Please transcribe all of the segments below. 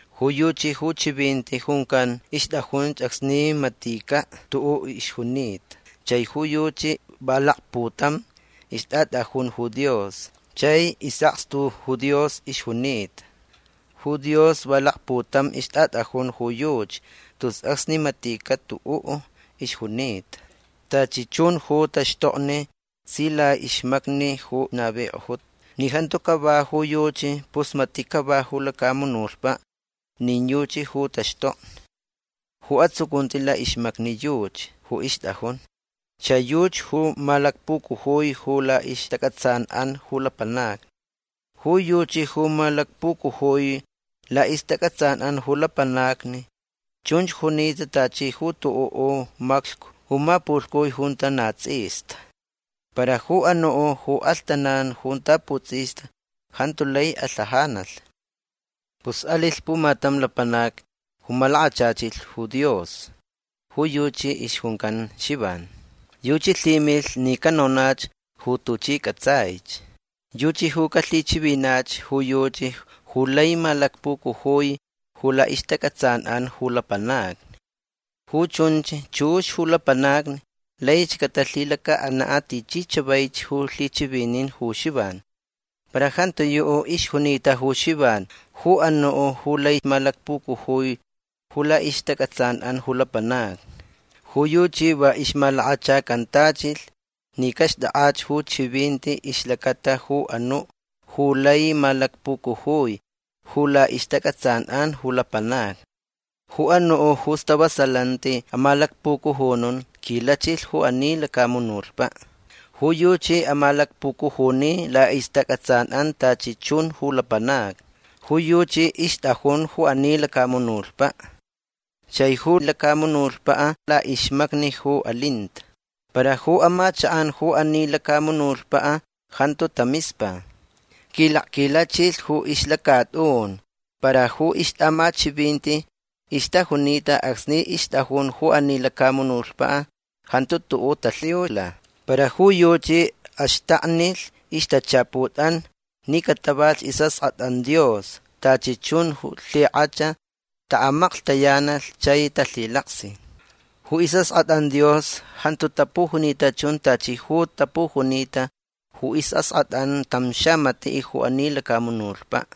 Ju yuchi ju Chivinti juncan ixtʼajunch acsni maticaʼ tuʼuʼ ixjunita. Chai ju yuchi va lakputam ixtʼatʼajun ju Dios. Chai isʼakstu ju Dios ixjunita. Ju Dios va lakputam ixtʼatʼajun ju yuchi tus acsni maticaʼ tuʼuʼ ixjunita. Tachi chun ju taxtokni si laʼixmacni ju navikʼojuta. Ni jantu cava ju yuchi pus matiʼ cava ju lacamunutpaʼ nin yuchi ju taxtokni. Ju atsucunti laʼixmacni yuchi ju ixtʼajun. Chai yuchi ju malacpucujui ju laʼixtacʼatsanʼan ju lapanacni. Ju yuchi ju malacpucujui laʼixtacʼatsanʼan ju lapanacni chunch junita tachi ju tuʼuʼ maclhcu ju mapulhcui junta na tsʼista. Para ju anuʼ ju alhtanan junta putsʼista jantu lai alhajanalh. Pus alilh pumatam lapanac ju malakachachilh ju Dios. Ju yuchi ixjuncan Xivan. Yuchi lhimilh ni canonach ju tuchi cʼatsaich. Yuchi ju calhichivinach ju yuchi ju lai malacpucujui ju laʼixtacʼatsanʼan ju lapanacni. Ju chunch chux ju lapanacni laich catalhilacaʼanaʼ tichi chavaich ju lhichivinin ju Xivan. Para jantiyuʼ ixjunita ju Xivan ju anuʼ ju lai malacpucujui ju laʼixtacʼatsanʼan ju lapanacni. Ju yuchi va ixmalakachacantachilh ni caxtʼakʼach ju chivinti ixlacata ju anuʼ ju lai malacpucujui ju laʼixtacʼatsanʼan ju lapanacni. Ju anuʼ ju istavasalanti amalacpucujunun quilachilh ju ani lacamunutpaʼ. Ju yuchi amalacpucujuni laʼixtacʼatsanʼan tachi chun ju lapanacni. Ju yuchi ixtʼajun ju ani lacamunutpaʼ. Chai ju lacamunutpaʼ laʼixmacni ju alinta. Para ju amachakʼan ju ani lacamunutpaʼ jantu tamispa. Quilakquilachilh ju ixlacatʼun. Para ju ixtʼaʼamachivinti ixtajunita acsni ixtʼajun ju ani lacamunutpaʼ jantu tuʼuʼ talhiula. Para ju yuchi axtaknilh ixtachaputʼan ni catavalhch isʼaskʼatʼan Dios tachi chun ju lhikʼach taʼamaklhtayanalh chai talhilaksi. Ju isʼaskʼatʼan Dios jantu tapujunita chun tachi ju tapujunita ju isʼaskʼatʼan tam xamatiʼ ju ani lacamunutpaʼ.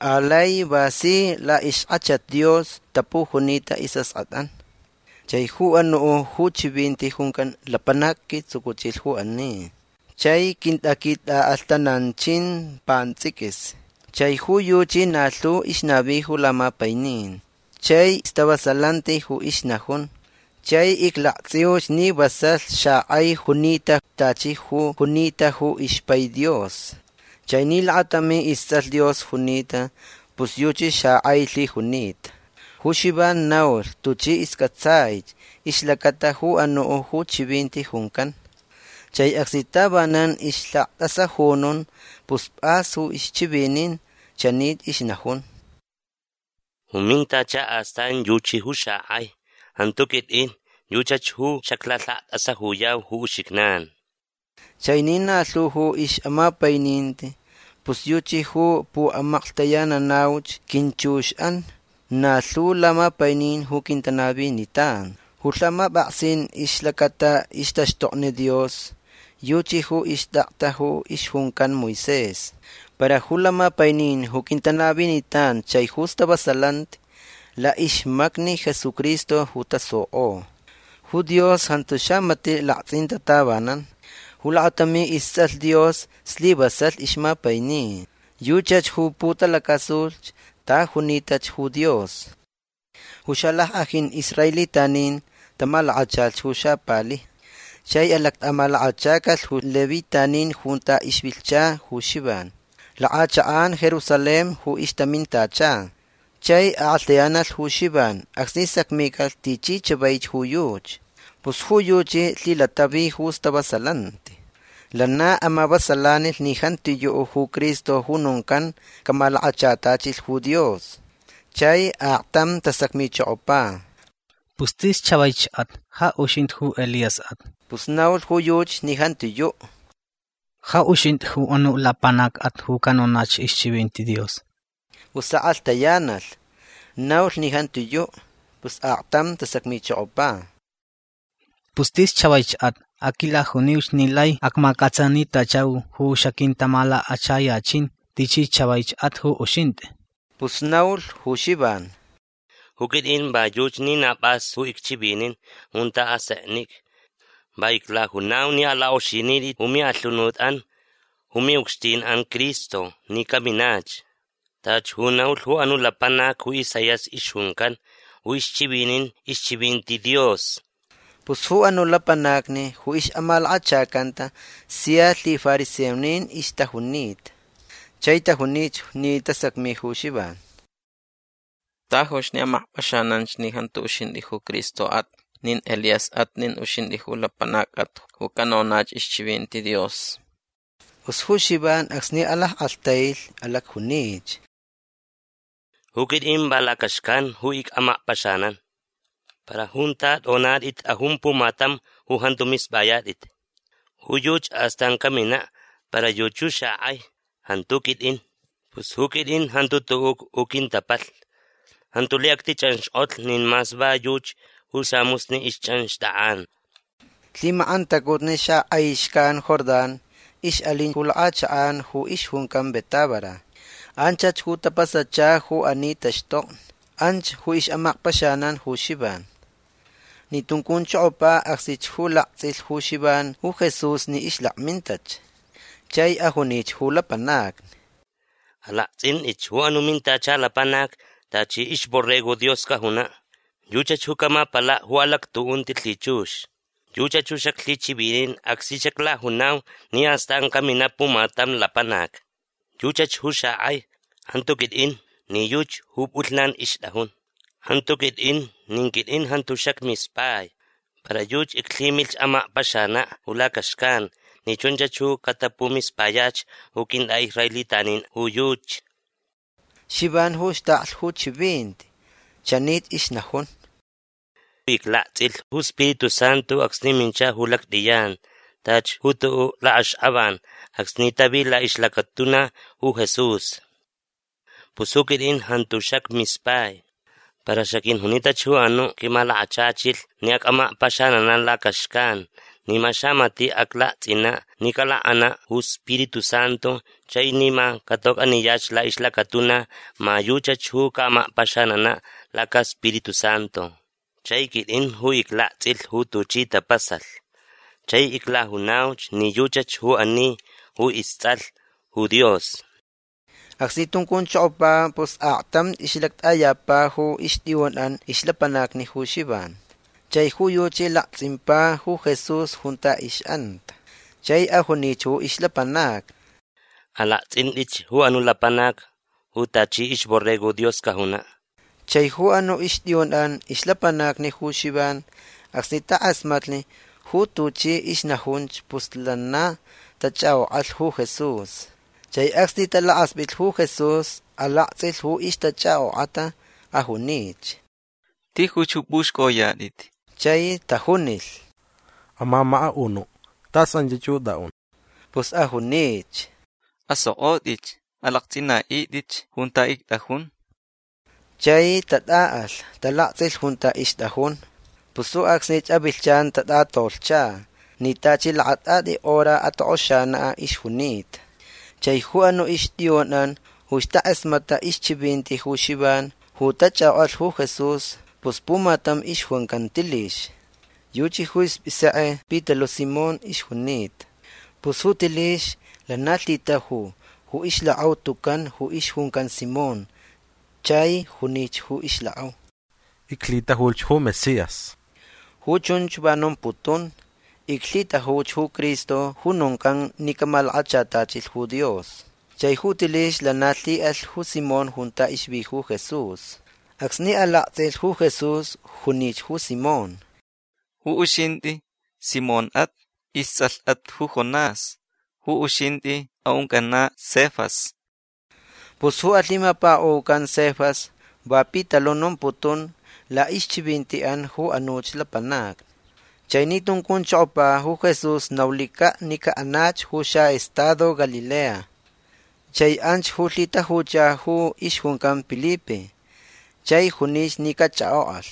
Alai va si laʼixkʼachat Dios tapujunita isʼaskʼatʼan. Chai ju anuʼ ju Chivinti juncan lapanac quitsucuchilh ju ani. Chai quintaquitʼaʼalhtananchin pantsʼiquis. Chai ju yuchi na lhu ixnavi ju lamapainin. Chai stavasalanti ju ixnajun. Chai iclaktsʼiuch ni vasalh xakʼai junita tachi ju junita ju ixpai Dios. Chai ni lakatami istsʼalh Dios junita pus yuchi xakʼai lhijunita. Ju Xivan naulh tuchi iscʼatsai ixlacata ju anuʼ ju chivinti juncan. Chai acsni tavanan ixlhaktʼasajunun pus pʼas ju ixchivinin. Chanich ixnajun: ―Ju mintacha astan yuchi ju xakʼai. Jantu quitʼin. Yuchach ju xaclalhaktʼasajuyau ju uxijnan. Chai ni na lhu ju ixʼamapaininti pus yuchi ju puʼamaklhtayananauch quinchuxʼan na lhu lamapainin ju quintanavinitan. Ju lhamapʼaksin ixlacata ixtaxtokni Dios yuchi ju ixtakta ju ixjuncan Moisés. Para ju lamapainin ju quintanavinitan chai ju stavasalanti laʼixmacni Jesucristo ju tasukʼo. Ju Dios jantu xamatiʼ laktsʼinta tavanan. Ju lakatami istsʼalh Dios slivasalh ixmapaini. Yuchach ju putalacasulh ta junitach ju Dios. Ju xalackʼajin israelitanin tamalakachalh ju xapalijni. Chai alactʼamalakachacalh ju levitanin junta ixvilhcha ju Xivan. Lakʼachakʼan Jerusalén ju ixtamintacha. Chai kʼalhtayanalh ju Xivan acsni sacmicalh tichi chavaich ju yuchi. Pus ju yuchi lhilatavi ju stavasalanti. Lana amavasalanilh ni jantiyuʼ ju Cristo ju noncan camalakachatachilh ju Dios. Chai aktam tasacmichokopa: ―Pus tis chavaichʼat. Ja uxintʼi ju Elíasʼat. Pus naulh ju yuchi ni jantiyuʼ. ―Ja uxintʼi ju anuʼ lapanacʼat ju canonach ixchivinti Dios. Pus akʼalhtayanalh. Naulh ni jantiyuʼ. Pus aktam tasacmichokopa: ―Pus tis chavaichʼat. Aquilajuniuch ni lai acmacʼatsanitachau ju xaquintamalakachayachin tichi chavaichʼat ju uxintʼi. Pus naulh ju Xivan: ―Ju quitʼin va yuchi ni na pʼas ju icchivinin junta aseknicʼa. Va iclajunau ni alakʼoxinitʼit ju miʼalhunutʼan ju miʼucxtinʼan Cristo ni caminach. Tachi ju naulh ju anuʼ lapanac ju Isaías ixjuncan ju ixchivinin ixchivinti Dios. Pus ju anuʼ lapanacni ju ixʼamalakachacanta sia lhifariseonin ixtajunita. Chai tajunich ni tasacmi ju Xivan: ―Tajuch ni amakpʼaxananch ni jantu uxintʼi ju Cristoʼat nin Elíasʼat nin uxintʼi ju lapanacʼat ju canonach ixchivinti Dios. Pus ju Xivan acsni alackʼalhtailh alacjunich: ―Ju quitʼin va lacaxcan ju icʼamakpaxanan. Para junta tʼonatʼit tʼajun pumatam ju jantu mispʼayatʼit. Ju yuchi astan caminaʼ. Para yuchi ju xakʼai. Jantu quitʼin. Pus ju quitʼin jantu tuʼuʼ ju quintapalhni. Jantu lai actichʼanxkʼotlh nin mas va yuchi ju samusni ixchʼanxtʼakʼan. Lhimakʼantacutni xakʼai xcan Jordán ixʼalin ju lakʼachakʼan ju ixjuncan Betábara. Anchach ju tapasacha ju ani taxtokni. Anch ju ixʼamakpaxanan ju Xivan. Ni tuncunchokopa acsnich ju laktsʼilhch ju Xivan ju Jesús ni ixlakmintach. Chai ajunich ju lapanacni: ―Alaktsʼintʼitch ju anuʼ mintacha lapanac. Tachi ixborrego Dios cajunaʼ. Yuchach ju camapalaʼ ju alactuʼunti lhichux. Yuchach ju xaclhichivinin acsni xaclajunau ni astan caminaʼ pumatam lapanac. Yuchach ju xakʼai. Jantu quitʼin ni yuchi ju pʼulhnan ixtʼajun. Jantu quitʼin. Nin quitʼin jantu xacmispai. Para yuchi iclhimilhch amakpaxanaʼ ju lacaxcan ni chunchach ju catapumispayach ju quintʼaʼisraelitanin ju yuchi. Xivan ju xtaklh ju chivinti. Chanich ixnajun: ―Iclaktsʼilh ju Spiritu Santu acsni mincha ju lactʼiyan tachi ju tuʼuʼ lakʼaxkʼavan acsni tavi laʼixlacatuna ju Jesús. Pus ju quitʼin jantu xacmispai. Para xaquijunitach ju anuʼ quimalakachachilh ni acʼamakpaxananaʼ lacaxcan ni ma xamatiʼ aclaktsʼinaʼ ni calakʼanaʼ ju Spiritu Santu chai ni ma catocʼaniyach laʼixlacatuna ma yuchach ju caʼamakpaxananaʼ lacaSpiritu Santu. Chai quitʼin ju iclaktsʼilh ju tuchi tapasalh. Chai iclajunauch ni yuchach ju ani ju istsʼalh ju Dios. Acsni tuncunchokopa pus aktamch ixʼalactʼayapa ju ixtʼiyunʼan ixlapanacni ju Xivan. Chai ju yuchi laktsʼimpa ju Jesús junta ixʼanta. Chai ajunich ju ixlapanacni: ―Alaktsʼintʼitch ju anuʼ lapanac ju tachi ixborrego Dios cajunaʼ. Chai ju anuʼ ixtʼiyunʼan ixlapanacni ju Xivan acsni takʼasmatlh ju tuchi ixnajunch pus lana tachʼakʼokʼalh ju Jesús. Chai acsni talakaspʼitlh ju Jesús alaktsʼilh ju ixtachʼakʼokʼata. Ajunich: ―Tijuch ju pʼuxcʼoyatʼit. Chai tajunilh: ―Amamakaʼunuʼ tas anchach ju tʼaʼun. Pus ajunich: ―Asokʼotʼitch. Alaktsʼinaʼitʼitch junta ictʼajun. Chai tatʼaʼalh. Talaktsʼilh junta ixtʼajun. Pus ju acsni avilhchan tatʼatolhcha ni tachi lakatʼatʼi hora atokʼoxanaʼ ixjunita. Chai ju anuʼ ixtʼiyunʼan ju ixtakʼasmatʼach ixchivinti ju Xivan ju tachʼakʼokʼalh ju Jesús pus pumatam ixjuncan Tilix. Yuchi ju ispʼisekʼe Pitaluʼ Simón ixjunita. Pus ju Tilix lana lhitaju ju ixlakʼau tucan ju ixjuncan Simón. Chai junich ju ixlakʼau: ―Iclhitajuch ju Mesías. Ju chunch va nomputun: “Iclhitajuch ju Cristo ju noncan ni camalakachatachilh ju Dios”. Chai ju Tilix lana lhiʼalh ju Simón junta ixvi ju Jesús. Acsni alaktsʼilh ju Jesús junich ju Simón: ―Ju uxintʼi Simónʼat. Istsʼalhʼat ju Jonás. Ju uxintʼi aʼuncʼanaʼ Cefas. Pus ju alhimapakaʼucan Cefas va Pitaluʼ nomputun laʼixchivintiʼan ju anuch lapanacni. Chai ni tuncunchokopa ju Jesús naulicaʼ ni caʼanach ju xaʼestado Galilea. Chai anch ju lhitajucha ju ixjuncan Pilipe. Chai junich ni cachʼakʼokʼalh.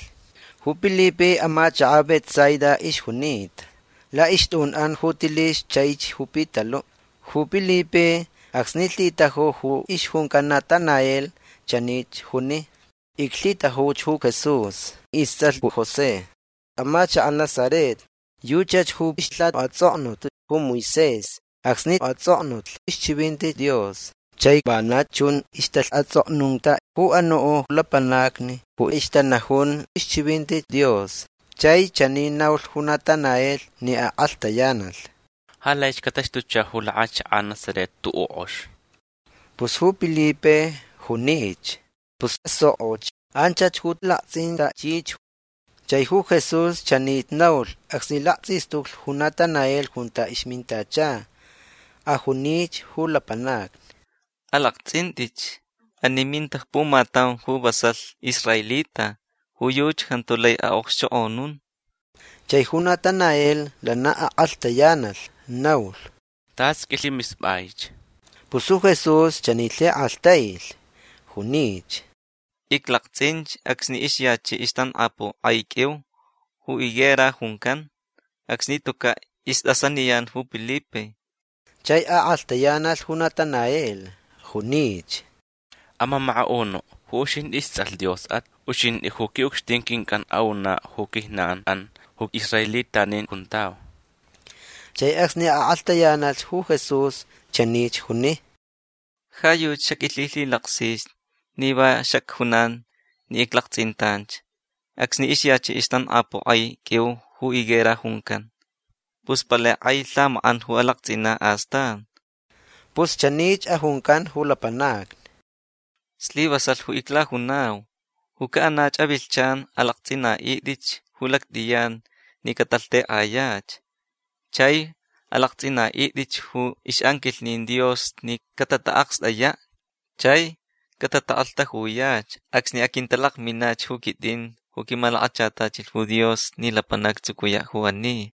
Ju Pilipe amachakaʼ Betsaida ixjunita. Laʼixtʼunʼan ju Tilix chaich ju Pitaluʼ. Ju Pilipe acsni lhitaju ju ixjuncan Natanael chanich juni: ―Iclhitajuch ju Jesús. Istsʼalh ju José. Amachakaʼ Nazaret. Yuchach ju ixlhatsʼoknunta ju Moisés acsni atsʼoknulh ixchivinti Dios. Chai vana chun ixtalhatsʼoknunta ju anuʼ lapanacni ju ixtanajun ixchivinti Dios. Chai chani naulh ju Natanael ni akʼalhtayanalh: ―Ja laich cataxtucha ju lakʼachakʼan Nazaret tuʼuʼ kʼox. Pus ju Pilipe junich: ―Pus asokʼoch. Anchach ju alaktsʼintʼachich. Chai ju Jesús chanich naulh acsni laktsʼistuclh ju Natanael junta ixmintacha. Ajunich ju lapanacni: ―Alaktsʼintʼitch. Ani minta pumatam ju vasalh israelita. Ju yuchi jantu lai aʼokxchokʼonun. Chai ju Natanael lana akʼalhtayanalh. Naulh: ―Tʼas qʼuilhimispʼaich. Pus ju Jesús chani lhikʼalhtailh. Junich: ―Iclaktsʼinch acsni ixyachiʼ ixtankʼapuʼ kʼai qʼuiu ju higuera juncan. Acsni tucaʼ istʼasaniyan ju Pilipe. Chai akʼalhtayanalh ju Natanael. Junich: ―Amamakaʼunuʼ ju uxintʼi istsʼalh Diosʼat. Uxintʼi ju quiʼucxtin quincʼan aʼunaʼ ju quijnanʼan ju israelitanin juntau. Chai acsni akʼalhtayanalh ju Jesús chanich juni: ―Ja yuchi xaqʼuilhilhilaksich ni va xacjunanch ni iclaktsʼintanch acsni ixyachiʼ ixtankʼapuʼ kʼai qʼuiu ju higuera juncan. Pus palai kʼai lhamakʼan ju alaktsʼinaʼ astan. Pus chanich ajuncan ju lapanacni: ―Slivasalh ju iclajunau. Ju caʼanach avilhchan alaktsʼinaʼitʼitch ju lactʼiyan ni catalhtekʼayach. Chai alaktsʼinaʼitʼitch ju ixʼanquilhnin Dios ni catataʼakstʼayaʼ chai catatakʼalhtajuyach acsni aquintalakminach ju quitʼin ju quimalakachatachilh ju Dios ni lapanac actsucuyaʼ ju ani.